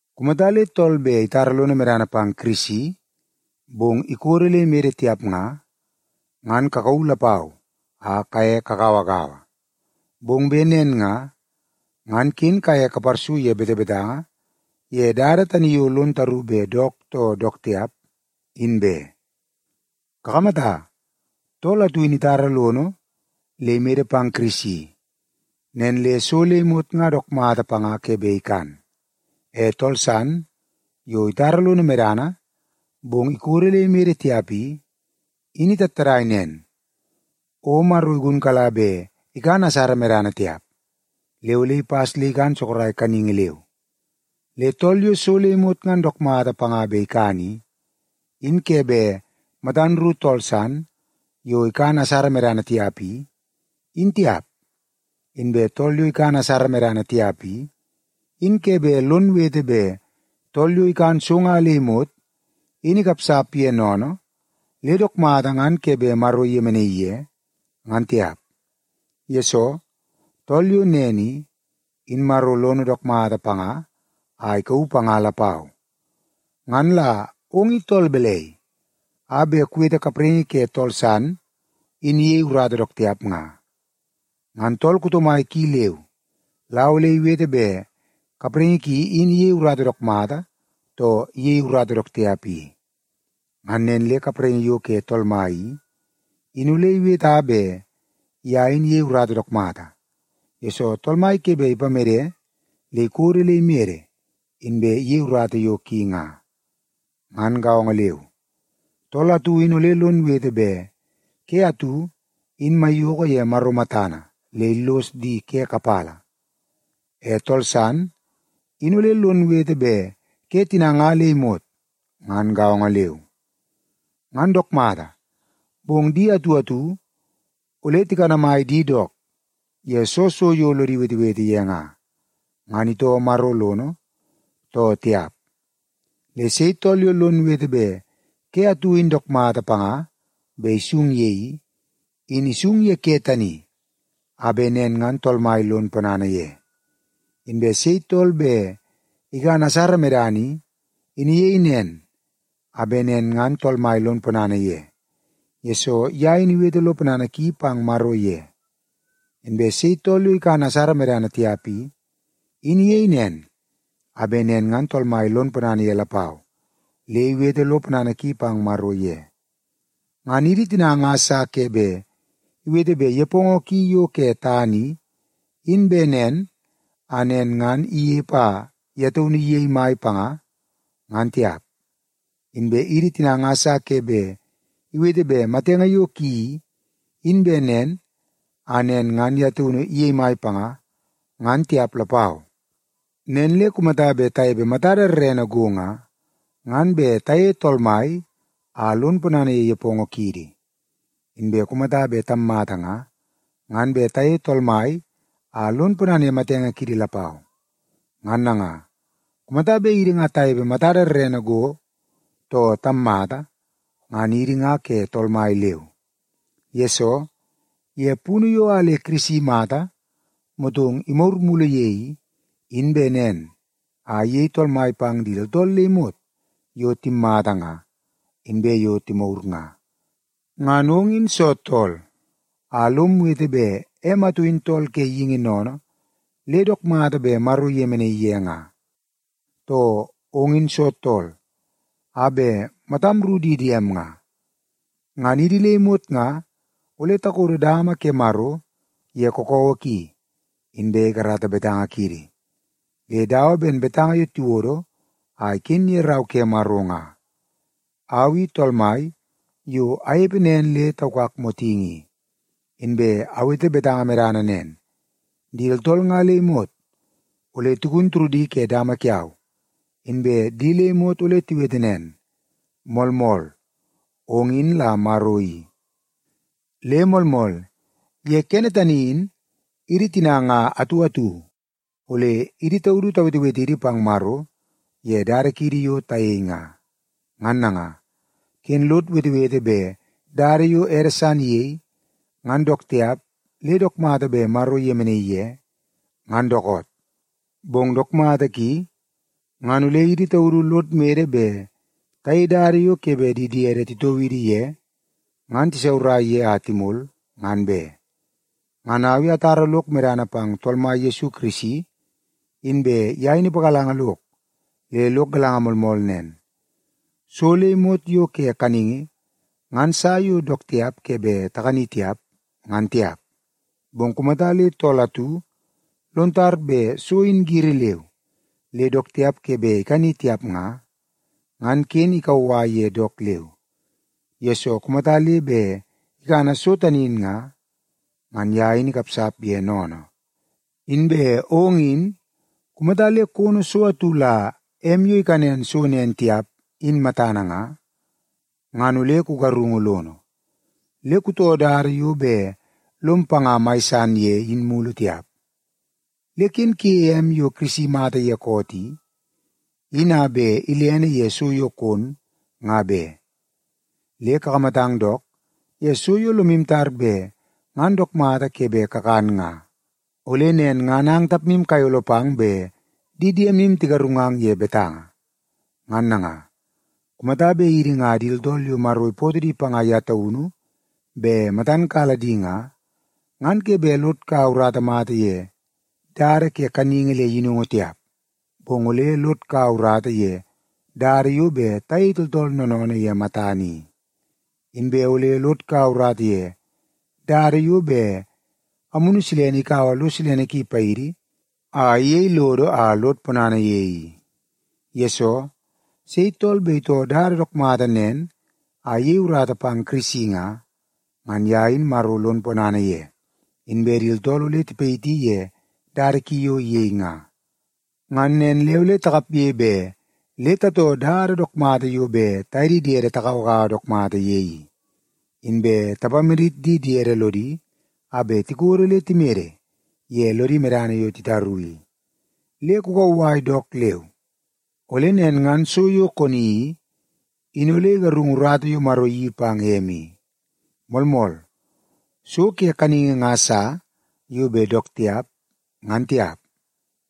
Kumata le tool bet itara lono medana pang Kirisi, bong ikodo le imede tiap nga, ngan kakauu lapau a kaye kagauagaua. Bong bet nen nga, ngan ken kaye kaparsu ye betebetanga ye dada tani yo lon taru bet dook too dook tiap, in be. Kakamata, tool atu in itara lono le imede pang Kirisi, nen le so le imot nga dook mata panga ke bet ikan. E tool san yo itara lono medana, bong ikodo le imede tiap i, in itattadai nen, o Maro igunkala bet ikan asara medana tiap, le ole ipas le ikan sorok kaningi leu. Le tool yo so le imot ngan dook mata panga bet ikan i, in ke bet matan ru tool san yo ikan asara medana tiap i, in tiap. Inbe tool yo ikan asara medana tiap i, in ke bet lon wete bet tool yo ikan so nga le imot in ikapsap ye sennene le dook mata ngan ke bet Maro iyemenaii ye, ngan tiap. Yesoo, tool yo nen i, in Maro lono dook mata panga a ikauu panga lapau. Ngan la ong i tool balai a bet kuwete kapraingi ke tool san in iyei urata dook tiap nga? Ngan tool kuto mai ki leu la ole iwete bet kapraingi ki in iyei urata dook mata, too iyei urata dook tiap i. Ngan nen le kapraingi yo ke Tool Mai i, in ole iweta bet ye in iyei urata dook mata, yesoo Tool Mai ke bet ipamede le ikodo le imede inbe iyei urata yo ki nga. Ngan gaongo leu, tool atu in ole lon wete bet ke atu in maiyoko ye Maro matana le illos di ke kapala. E tool san in ole lon wete bet ke tina nga le imot ngan gaongo leu. Ngan dook mata, bong di atu atu ole tikanamai di dook ye soo so yo lodi wetewete ye nga, ngan itoo Maro lono, too tiap. Le sei tool yo lon wete bet ke atu in dook mata panga bet isung ye i, in isung ye ke tani a bet nen ngan Tool Mai lon ponana ye. Inbe sei tool bet ikan asara medana i, in iyei nen a bet nen ngan Tool Mai lon ponana ye, yesoo ye in iwete lo ponana ki pang Maro ye. Inbe sei tool yo ikan asara medana tiap i, in iyei nen a bet nen ngan Tool Mai lon ponana ye lapau, le iwete lo ponana ki pang Maro ye. Ngan idi tina nga sa ke bet iwete bet nepongo ki yo ke tana i, in bet nen a nen ngan inepe a ye taunu iyei mai panga, ngan tiap. Inbe idi tina nga sa ke bet iwete bet matenge yo ki i, in bet nen a nen ngan ye taunu iyei mai panga, ngan tiap lapau. Nen le kumata bet tanepe matada rerene go nga, ngan bet tayeie Tool Mai a lon ponana ye nepongo kiidi. Inbe kumata bet tammata nga, ngan bet tayeie Tool Mai a lon ponana ye matenge kiidi lapau. Ngan nanga, kumata bet idi nga tanepe matada rerene go, too tammata, ngan idi nga ke Tool Mai leu. Yesoo, ye punu yo a le Kirisi imata motong imagur mulu ye i, in bet nen a iyei Tool Mai pang di tooltool le imot yo timmata nga, inbe yo timagur nga. Ngan ong in soo tool a lom wete bet em atu in tool ke geingi sennene le dook mata bet Maro iyemenaii ye nga? Too, ong in soo tool a bet matam ru di diem nga? Ngan idi le imot nga ole takodo dama ke Maro ye kakawa ki, inbe ikarata betanga kiidi. Le dawa ben betanga yo tiwodo a iken ye Rau ke Maro nga, “Au i Tool Mai yo anepe nen le taukak motingi i. Inbe awete betanga medana nen: Di tooltool nga le imot ole tigun turudi ke dama kiau, inbe di le imot ole tiwete nen, ‘Moolmool, ong in la Maro i.’” Le moolmool, ye kene tani in idi tina nga atu atu ole idi taudu tawetewetidi pang Maro ye dada kiidi yo tayei nga. Ngan nanga, ken lod wetewete bet dada yo ede san iyei, ngan dook tiap le dook mata bet Maro iyemenaii ye, ngan dookoot. Bong dook mata ki ngan ole idi taudu lod mede bet tayei dada yo ke bet di diede titoo idi ye ngan tisaurai ye a timol, ngan be. Ngan au i atara lok medana pang Tool Mai Yesu Kirisi, inbe ye in ipagalanga lok le lok galanga moolmool nen: So le imot yo ke kaningi ngan sa yo dook tiap ke bet takani tiap, ngan tiap. Bong kumata le tool atu lon tar bet so in giri leu le dook tiap ke bet ikani tiap nga, ngan ken ikauwai ye dook leu, yesoo kumata le bet ikana so tani in nga, ngan ye in ikapsap ye sennene. Inbe ong in, kumata le kono so atu la em yo ikanen so nen tiap in matana nga, ngan ole kugarungu lono, le kutoo dada yo bet lom panga mai san ye in mulu tiap. Le ken kuyeie em yo Kirisi imata ye koot i, in a bet ilene ye so yo kon, nga be. Le kakamatang dook ye so yo lomu tar bet ngan dook mata ke bet kakan nga, ole nen ngan ang tapmu kayolo pang le di diemu tigarungang ye betanga. Ngan nanga, kumata bet idi nga di tooltool yo Maro ipootoo di panga ye taunu bet matan kala di nga, ngan ke bet lod kaua urata mata ye dada ke kaningi le yinungu tiap, bong ole lod kaua urata ye dada yo bet tayei tooltool noonoonoo ye matana i. Inbe ole lod kaua urata ye dada yo bet Amunu Silene ikaua lo silene ki paidi a iyei lodo a lod ponana ye i. Yesoo, sei tool bet itoo dada dook mata nen a iyei urata pang Kirisi nga, ngan ye in Maro lon ponana ye, inbe di tooltool ole tipayiti ye dada ki yo iyei nga. Ngan nen le ole takapge bet le tatoo dada dook mata yo bet taye di diede tagauagaua dook mata ye i, inbe tapamadit di diede lodi a bet tikodo le timede ye lodi medana yo titaru i. Le kukauwai dook leu, ole nen ngan so yo koni i, in ole igarungu urata yo Maro iyeii pang em i. Moolmool, so ke kaningi nga sa yo bet dook tiap, ngan tiap,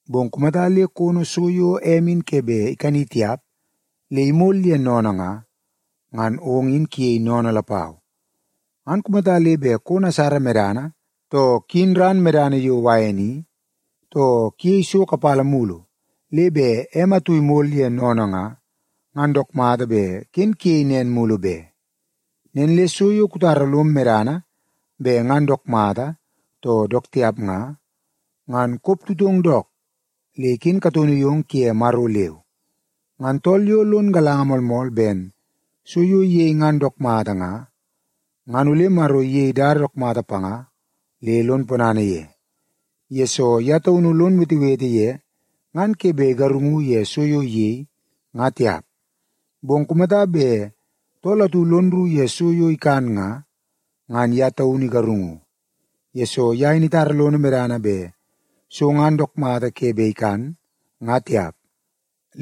bong kumata le kono so yo em in ke bet ikani tiap le imol ye sennene nga, ngan ong in kuyei sennene lapau. Ngan kumata le bet kon asara medana, too kuyin ran medana yo wain i, too kuyei so kapala mulu le bet em atu imol ye sennene nga, ngan dook mata bet ken kuyei nen mulu be. Nen le so yo kutara lom medana bet ngan dook mata too dook tiap nga, ngan koptutong dook le iken kataunu yong kuye Maro leu. Ngan tool yo lon galanga moolmool ben so yo iyei ngan dook mata nga, ngan ole Maro iyei dada dook mata panga le lon ponana ye, yesoo ye taunu lon wetewete ye ngan ke bet igarungu ye so yo iyei, nga tiap. Bong kumata bet tool atu lon rru ye so yo ikan nga, ngan ye taunu igarungu, yesoo ye in itara lono medana bet so ngan dook mata ke bet ikan, nga tiap.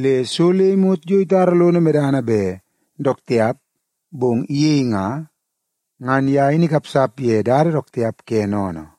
Le so le imot yo itara lono medana bet dook tiap bong iyei nga, ngan ye in ikapsap ye dada dook tiap ke sennene.